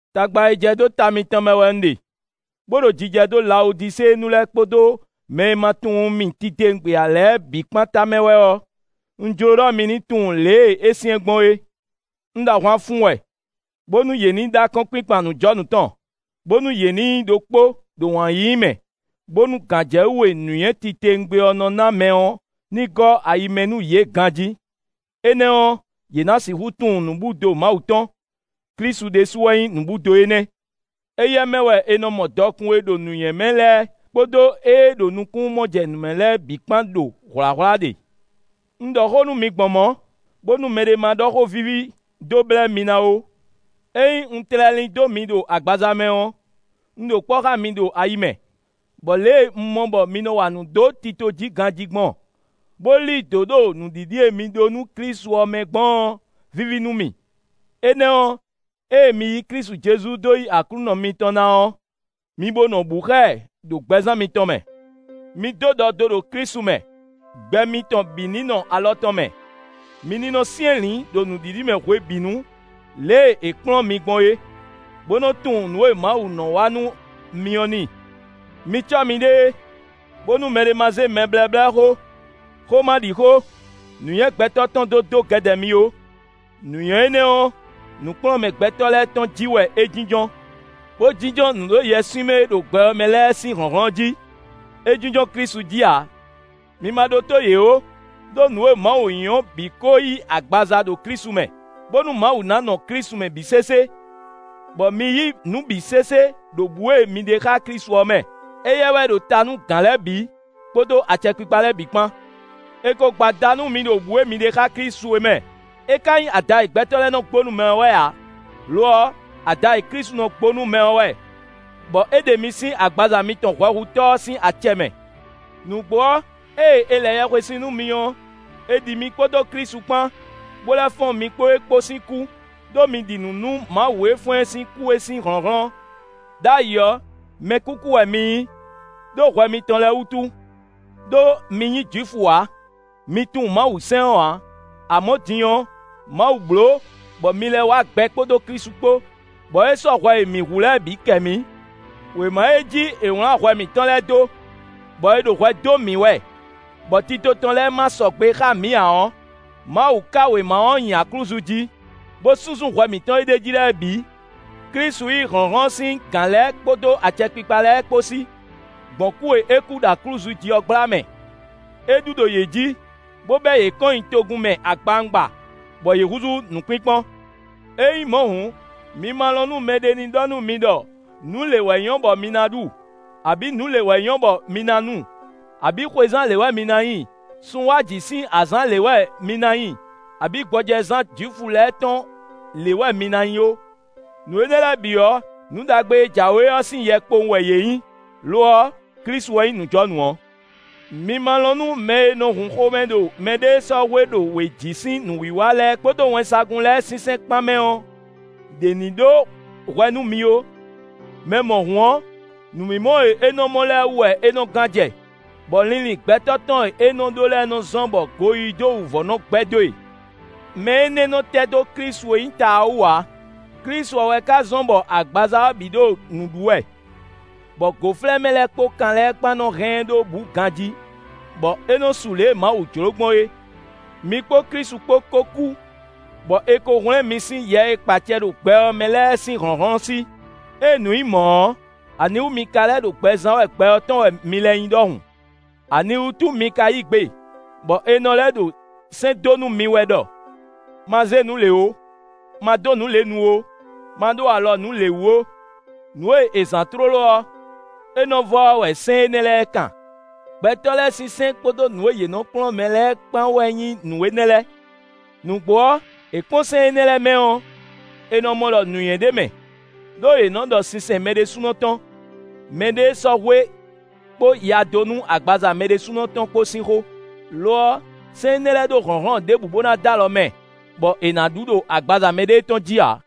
Tagba e jɛ dó ta mitɔn mɛ wɛ un ɖe, bó ɖo jijɛ dó Lawodiséenu lɛ́ɛ kpódó mɛ e ma tunwun mì titewungbe lě ǎ lɛ́ɛ bǐ kpán tamɛ wɛ ɔ́, un jló ɖɔ mi ní tunwun lě e é syɛ́n gbɔn é. Un ɖo ahwan fun wɛ, bónú yě ní ɖó akɔ́nkpinkpan nǔjɔnǔ tɔn, bónú yě ní nyí ɖokpó ɖo wǎn yíyí mɛ, bónú gǎnjɛwú e nǔnywɛ́ titewungbe ɔ́ nɔ ná mɛ ɔ́ ní gɔ́ ayi mɛ nú yě ganjí; énɛ́ ɔ́, yě ná sixú tunwun nǔbúdo Mawu tɔn; Klísu ɖésú wɛ nyí nǔbúdo énɛ́. Éyɛ́ mɛ wɛ è nɔ mɔ dɔkun e ɖo nǔnywɛ́ mɛ lɛ́ɛ kpódó ée ɖo nukúnnú-mɔjɛnǔmɛ lɛ́ɛ bǐ kpán ɖo hwlǎhwlá ɖe. Un ɖɔ xó nú mi gbɔn mɔ̌, bónú mɛɖé ma ɖɔ xó víví dó blɛ́ mi ná ó. Ényí un tlɛ lín dó mi ɖo agbaza mɛ ɔ́, un ɖo kpɔ́ xá mi ɖo ayi mɛ, bɔ lě e un mɔ bɔ mi nɔ wa nǔ dó tito jí ganjí gbɔn, bó lí dǒ ɖo nǔɖiɖi e mi ɖó nú Klísu ɔ́ mɛ gbɔn ɔ́, víví nú mì. Énɛ́ ɔ́, ée mi yí Klísu Jezu dó yí Aklúnɔ mitɔn ná ɔ́, mi bo nɔ bǔ xá ɛ ɖo gbɛzán mitɔn mɛ. Mi dó ɖɔ do ɖo Klísu mɛ; gbɛ mitɔn bǐ ní nɔ alɔ tɔn mɛ; mi ní nɔ syɛ́nlǐn ɖo nǔɖiɖi mɛ hwebǐnu lě e è kplɔ́n mi gbɔn é, bó nɔ tunwun nǔ e Mawu nɔ wa nú mi ɔ́ n'i. Mi cɔ́ miɖée, bónú mɛɖé ma zé mɛblɛ́blɛ́xó, xómaɖixó, nǔnywɛ́ gbɛtɔ́ tɔn dó dó gɛdɛ mi ó; nǔnywɛ́ énɛ́ ɔ́, nǔkplɔ́nmɛ gbɛtɔ́ lɛ́ɛ tɔn jí wɛ é jínjɔ́n, bó jínjɔ́n nǔɖoyɛswímɛ e ɖo gbɛ ɔ́ mɛ lɛ́ɛ sín hlɔ̌nhlɔ́n jí; é jínjɔ́n Klísu jí ǎ. Mi ma ɖótó yě ó; ɖó nǔ e Mawu nyí ɔ́ bǐ ko yí agbaza ɖo Klísu mɛ, bónú Mawu ná nɔ Klísu mɛ bǐ sésé, bɔ mi yí nǔ bǐ sésé ɖo bǔ e mi ɖe xá Klísu ɔ́ mɛ. Éyɛ́ wɛ ɖo ta nú gǎn lɛ́ɛ bǐ, kpódó acɛkpikpa lɛ́ɛ bǐ kpán. È ko gbo ada nú mi ɖo bǔ e mi ɖe xá Klísu é mɛ; é ka nyí ada e gbɛtɔ́ lɛ́ɛ nɔ gbo nú mɛ ɔ́ wɛ ǎ; lo ɔ́, ada e Klísu nɔ gbo nú mɛ ɔ́ wɛ, bɔ é ɖe mi sín agbaza mitɔn hwɛhutɔ́ ɔ́ sín acɛ mɛ. Nǔgbó ɔ́, ée è lɛ yɛhwesin nú mi ɔ́, è ɖi mi kpódó Klísu kpán, bó lɛ́ fɔ́n mi kpó e kpó sín kú, ɖó mi ɖi nǔ nú Mawu e fɔ́n ɛ sín kú é sín hlɔ̌nhlɔ́n. Đ'ayǐ ɔ́, mɛkúkú wɛ mi nyí, ɖó hwɛ mitɔn lɛ́ɛ wútu; ɖó mi nyí Jwifu ǎ; mi tunwun Mawusɛ́n ɔ́ ǎ; amɔ̌ din ɔ́, Mawu bló, bɔ mi lɛ́ wá gbɛ kpódó Klísu kpó, bɔ é sɔ́ hwɛ e mǐ hu lɛ́ɛ bǐ kɛ mǐ. Wěma e jí è wlǎn hwɛ mǐtɔn lɛ́ɛ dó, bɔ è ɖo hwɛ dó mǐ wɛ, bɔ tito tɔn lɛ́ɛ ma sɔgbe xá mǐ ǎ ɔ́, Mawu ká wěma ɔ́ nyi aklúzu jí, bó súnsún hwɛ mǐtɔn e ɖ'é jí lɛ́ɛ bǐ. Klísu yí hlɔ̌nhlɔ́n sín gǎn lɛ́ɛ kpódó acɛkpikpa lɛ́ɛ kpó sí, gbɔn kú e é kú ɖo aklúzu jí ɔ́ gbla mɛ; é ɖu ɖo yě jí, bó bɛ́ yě kɔn nyi togun mɛ agbawungba, bɔ yě húzú nǔkpínkpɔ́n. Ényí mɔ̌ hǔn, mi ma lɔn nú mɛɖé ní ɖɔ nú mi ɖɔ nǔ lě wɛ nyɔ́ bɔ mi ná ɖu, abǐ nǔ lě wɛ nyɔ́ bɔ mi ná nu, abǐ xwezán lě wɛ mi ná nyi, sun wá jǐ sín azǎn lě wɛ mi ná nyi, abǐ gbɔjɛzán Jwifu lɛ́ɛ tɔn lě wɛ mi ná nyi ó. Nǔ énɛ́ lɛ́ɛ bǐ ɔ́, nǔ ɖagbe e jǎwe ɔ́ sín yɛ kpowun wɛ yě nyǐ; lo ɔ́, Klísu wɛ nyí nǔjɔnǔ ɔ́. Mi ma lɔn nú mɛ e nɔ hun xomɛ ɖo mɛɖéesɔ́hwe ɖo wějí sín nǔwiwa lɛ́ɛ kpódó wɛnsagun lɛ́ɛ sinsɛn kpán mɛ ɔ́, ɖě ní ɖó hwɛ nú mi ó; mɛ mɔ̌hun ɔ́, nǔmimɔ e é nɔ mɔ lɛ́ɛ wú wɛ é nɔ gán jɛ, bɔ linlin gbɛtɔ́ tɔn e é nɔ ɖó lɛ́ɛ nɔ zɔ́n bɔ goyíyí dó wǔvɔ́ nɔ gbɛ́ dó e. Mɛ énɛ́ nɔ tɛ́ dó Klísu e nyí ta ɔ́ wú ǎ. Klísu ɔ́ wɛ ka zɔ́n bɔ agbaza ɔ́ bǐ ɖo nǔ ɖu wɛ, bɔ gǒflɛ́mɛ lɛ́ɛ kpódó kan lɛ́ɛ kpán nɔ hɛn ɛ ɖó bǔ ganjí, bɔ é nɔ su lě e Mawu jló gbɔn é. Mi kpó Klísu kpó kó kú, bɔ è ko hwlɛ́n mi sín yɛ e kpa acɛ ɖo gbɛ ɔ́ mɛ lɛ́ɛ sín hlɔ̌nhlɔ́n sí. Ée nǔ nyí mɔ̌ ɔ́, aniwú mi ka lɛ́ ɖo gbɛ zán wɛ gbɛ ɔ́ tɔn wɛ mi lɛ́ nyí ɖɔhun? Aniwútu mi ka yí gbe, bɔ è nɔ lɛ́ ɖo sɛ́n dó nú mi wɛ ɖɔ: “Ma zé nǔ lě ó! Ma dó nǔ lě nu ó! Ma ɖó alɔ nǔ lě wú ó!” Nǔ e è zǎn tlóló ɔ́, é nɔ vɔ ɔ́ wɛ sɛ́n énɛ́ lɛ́ɛ kan; gbɛtɔ́ lɛ́ɛ sín sɛ́n kpódó nǔ e yě nɔ́ kplɔ́n mɛ lɛ́ɛ kpán wɛ nyí nǔ énɛ́ lɛ́ɛ. Nǔgbó ɔ́, è kpɔ́n sɛ́n énɛ́ lɛ́ɛ mɛ ɔ́, è nɔ mɔ ɖɔ nǔnywɛ́ ɖ'é mɛ, ɖó yě nɔ́ ɖɔ sinsɛn mɛ ɖésúnɔ tɔn, mɛɖéesɔ́hwe kpó ya dó nú agbaza mɛ ɖésúnɔ tɔn kpó sín xó. Lo ɔ́, sɛ́n énɛ́ lɛ́ɛ ɖó hlɔ̌nhlɔ́n ɖěbǔ bó ná dó alɔ mɛ, bɔ è nǎ ɖu ɖo agbaza mɛɖée tɔn jí ǎ.